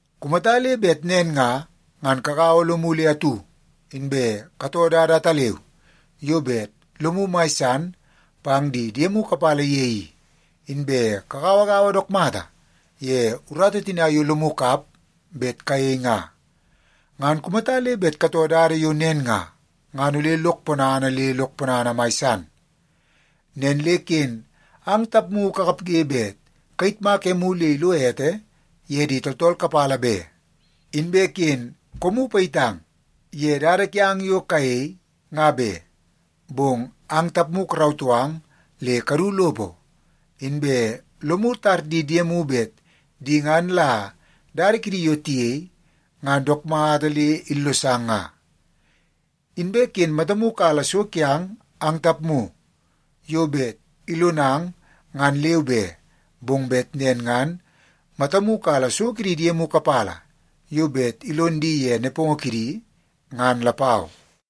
Kumata le bet nen nga, ngan kagaua lomu le atu, inbe katoo dada ataleu yo bet lomu mai san pang di diemu kapala ye i, inbe kagauagaua dook mata ye urata tina yo lomu kap bet kayei nga. Ngan kumata le bet katoo dada yo nen nga, ngan ole lok ponana le lok ponana mai san. Nen le ken ang tapmu kakapge bet kayitmak emu le ilo ete ye di tooltool kapala be. Inbe ken koomu payitang ye dada kiang yo kayei, nga be. Bong ang tapmu karautoo ang le kadu lopo, inbe lomu tar di diemu bet di ngan la dada kidi yo tiyei ngan dook mata le illosang nga. Inbe ken matamu kala so kiang ang tapmu yo bet ilonang ngan leu be, bong bet nen ngan matamu kala so kidi diemu kapala yo bet ilon di ye nepongo kidi, ngan lapau.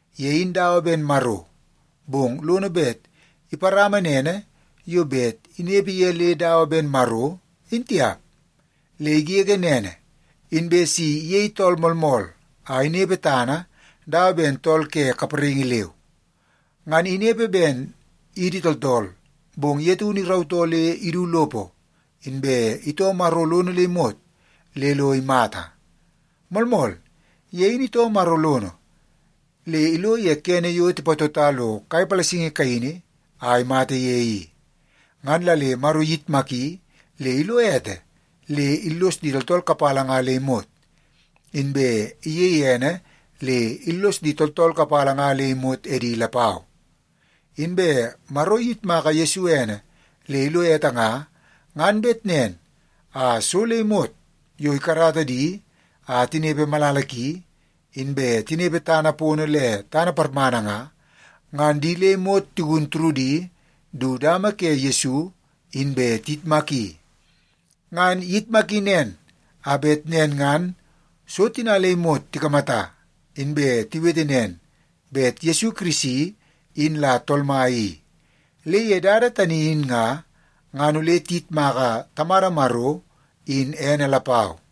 Ye in dawa ben Maro, bong lono bet iparama nene yo bet inepe le dawa ben Maro, in tiap. Le igege nene, inbe si iyei tool moolmool a inepe tana dawa ben tool ke kapraingi leu. Ngan inepe ben idi tooltool, bong ye taunu irautoo le idu lopo, inbe itoo Maro lono le imot le lo imata. Moolmool, ye in itoo Maro lono le ilo ye kene yo tipatota lo kai palasingi kaini a imata ye i. Ngan la le Maro iyitmaki le ilo ete le illos di tooltool kapala nga le imot, inbe iyeie ene le illos di tooltool kapala nga le imot edi lapau. Inbe Maro iyitmaka Yesu ene le ilo ete nga, ngan bet nen a so le imot yo ikarata di a tinepe malala ki, inbe tinepe tana pono le tana parmana nga, ngan di le imot tigun turudi du dama ke Yesu inbe tiyitmaki. Ngan iyitmaki nen, a bet nen ngan so tina le imot tikamata, inbe tiwete nen bet Yesu Kirisi in la Tool Mai i. Le ye dada tani in nga, ngan ole tiyitmaka Tamada Maro in ene lapau.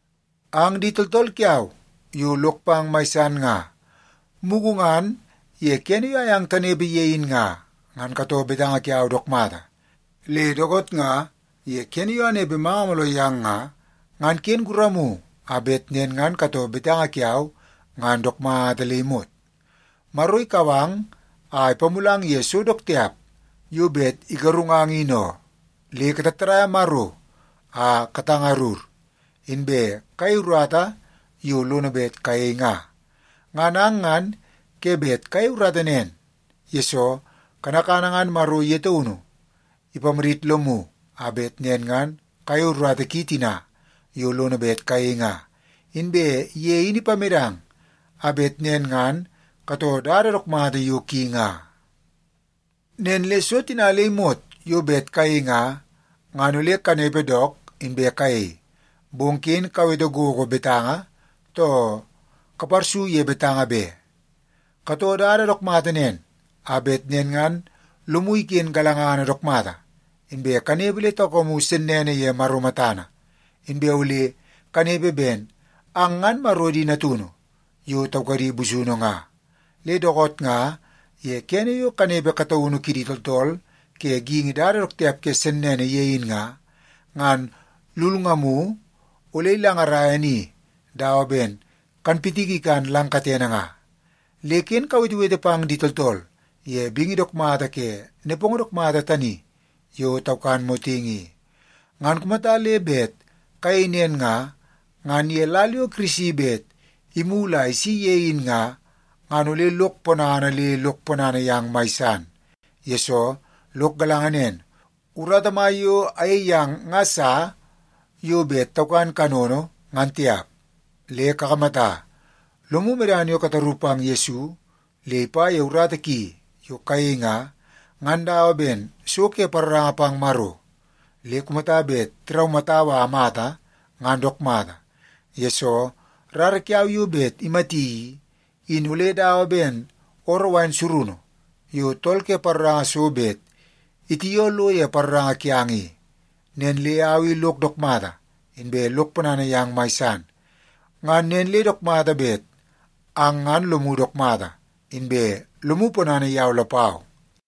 Ang di tooltool kiau yo lok pang mai san nga, mugu ngan ye kene yo ayang tanepe ye in nga, ngan katoo betanga kiau dook mata. Le dookoot nga ye kene yo anepe manga mooloo yang nga, ngan ken guramu a bet nen ngan katoo betanga kiau ngan dook mata le imot. Maro ikau ang a ipamulang ye so dook tiap yo bet igarungang in oo, le katattadaia Maro a katangarur, inbe kayei urata yo lono bet kayei nga. Ngan ang ngan ke bet kayei urata nen, yesoo kanakana ngan Maro ye taunu ipamadit lomu a bet nen ngan kayei urata ki tina yo lono bet kayei nga. Inbe ye in ipamedang a bet nen ngan katoo dada dook mata yo ki nga. Nen le so tina le imot yo bet kayei nga, ngan ole kanepe dook, inbe kayei. Bong ken kawete gogo betanga, too kaparsu ye betanga be. Katoo dada dook mata nen, a bet nen ngan lomu iken galangana dook mata, inbe kanepe le taukamu sennene ye Maro matana. Inbe ole kanepe ben ang ngan Maro di natunu yo taukadi busunu nga. Le dookoot nga ye kene yo kanepe kataunu kidi tooltool ke geingi dada dook tiap ke sennene ye in nga, ngan lulngamu ole ilangaraia ni dawa ben kanpitiki ikan lang katene nga. Le ken kawetewete pang di tooltool ye bingi dook mata ke nepongo dook mata tani yo taukan motingi i. Ngan kumata le bet kayei nen nga, ngan ye lal yo Kirisi bet imulu a isi ye in nga, ngan ole lok ponana le lok ponana yang mai san. Yesoo, lok galanga nen, urata mai yo ayei yang nga sa yo bet taukan kanono, ngan tiap. Le kakamata, lomu medana yo kataru pang Yesu le ipa ye urata ki yo kayei nga, ngan dawa ben so ke paroranga pang Maro. Le kumata bet tiraumatau a amata, ngan dook mata, yesoo rara kiau yo bet imati i, in ole dawa ben ooroo wain surunu yo tool ke paroranga so bet itioo lo ye paroranga kiang i. Nen le au i lok dook mata, inbe lok ponana yang mai san. Ngan nen le dook mata bet ang ngan lomu dook mata, inbe lomu ponana yau lapau.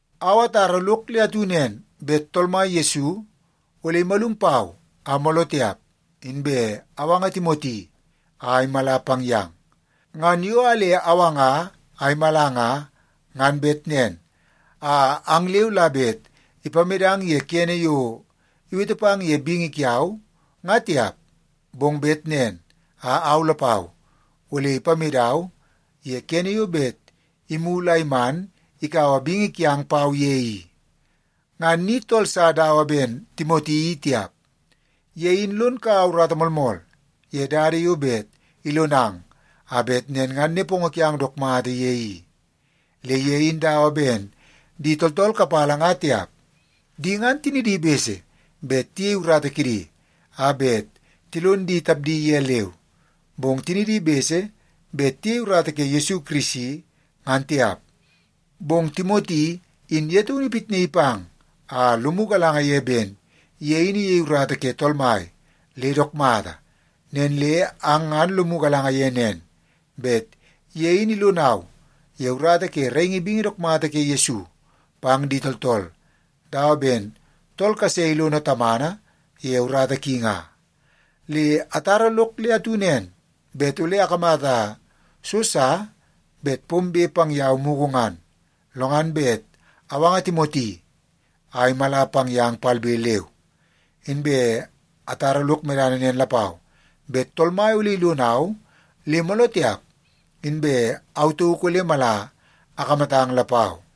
Au atara lok le atu nen, bet Tool Mai Yesu ole imalum pau a mooloo tiap, inbe awanga Timoti a imala pang yang. Ngan yo a le awanga a imala nga, ngan bet nen a ang leu la bet ipamedang ye kene yo iwete pang ye bingi kiau, nga tiap, bong bet nen a au lapau ole ipamedau ye kene yo bet imulu a iman ikaua bingi kiang pau ye i. Ngan ni tool sa dawa ben Timoti i tiap. Ye in lon kaua urata moolmool ye dada yo bet ilonang a bet nen ngan nepongo kiang dook mata ye i. Le ye in dawa ben di tooltool kapala nga tiap. Di ngan tinidi bese bet tiyei urata kidi a bet tilon di tapdi ye leu, bong tinidi bese bet tiyei urata ke Yesu Kirisi, ngan tiap. Bong Timoti in ye taunu ipitnaii pang a lomu galanga ye ben ye in iyei urata ke Tool Mai le dook mata. Nen le ang ngan lomu galanga ye nen, bet ye in ilonau ye urata ke raingi bingi dook mata ke Yesu pang di tooltool dawa ben tool kase ilono tamana ye urata ki nga. Le atara lok le atu nen, bet ole akamata so sa bet pombe pang yau mugu ngan, lo ngan bet awanga Timoti a imala pang yang palbe leu. Inbe atara lok medana nen lapau, bet Tool Mai ole ilonau le mooloo tiap, inbe au tauk ole mala akamatang lapau.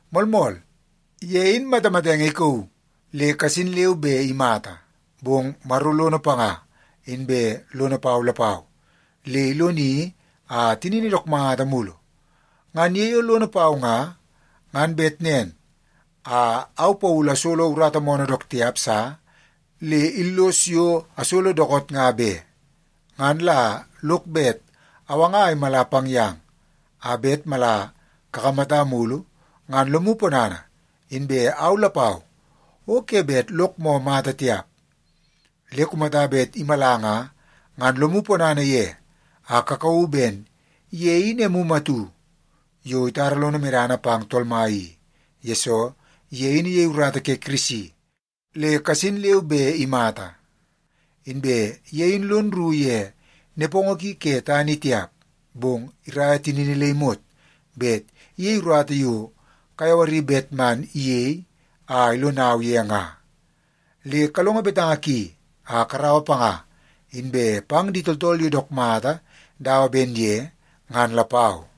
Moolmool, ye in matamatenge ikauu le kasin leu be imata. Bong Maro lono panga inbe lono pau lapau, le iloni a tinini dook mata mulu. Ngan ye yo lono pau nga, ngan bet nen a au Paulu asolo urata moonoo dook tiap sa le illos yo asolo dookoot nga be. Ngan la lok bet awanga a imala pang yang, a bet mala kakamata mulu, ngan lomu ponana. Inbe au lapau o ke bet lok moo mata tiap. Le kumata bet imala nga, ngan lomu ponana ye a kakauu ben ye in emu atu yo itara lono medana pang Tool Mai i. Yesoo, ye in iyei urata ke Kirisi, le kasin leu be imata. Inbe ye in lon rru ye nepongo ki ke tana i tiap, bong iraia tinini le imot bet iyei urata yo kayawari bet man iyei a ilonau ye nga. Le kalongo betanga ki a karaua panga, inbe pang di tooltool yo dook mata dawa ben ye ngan lapau.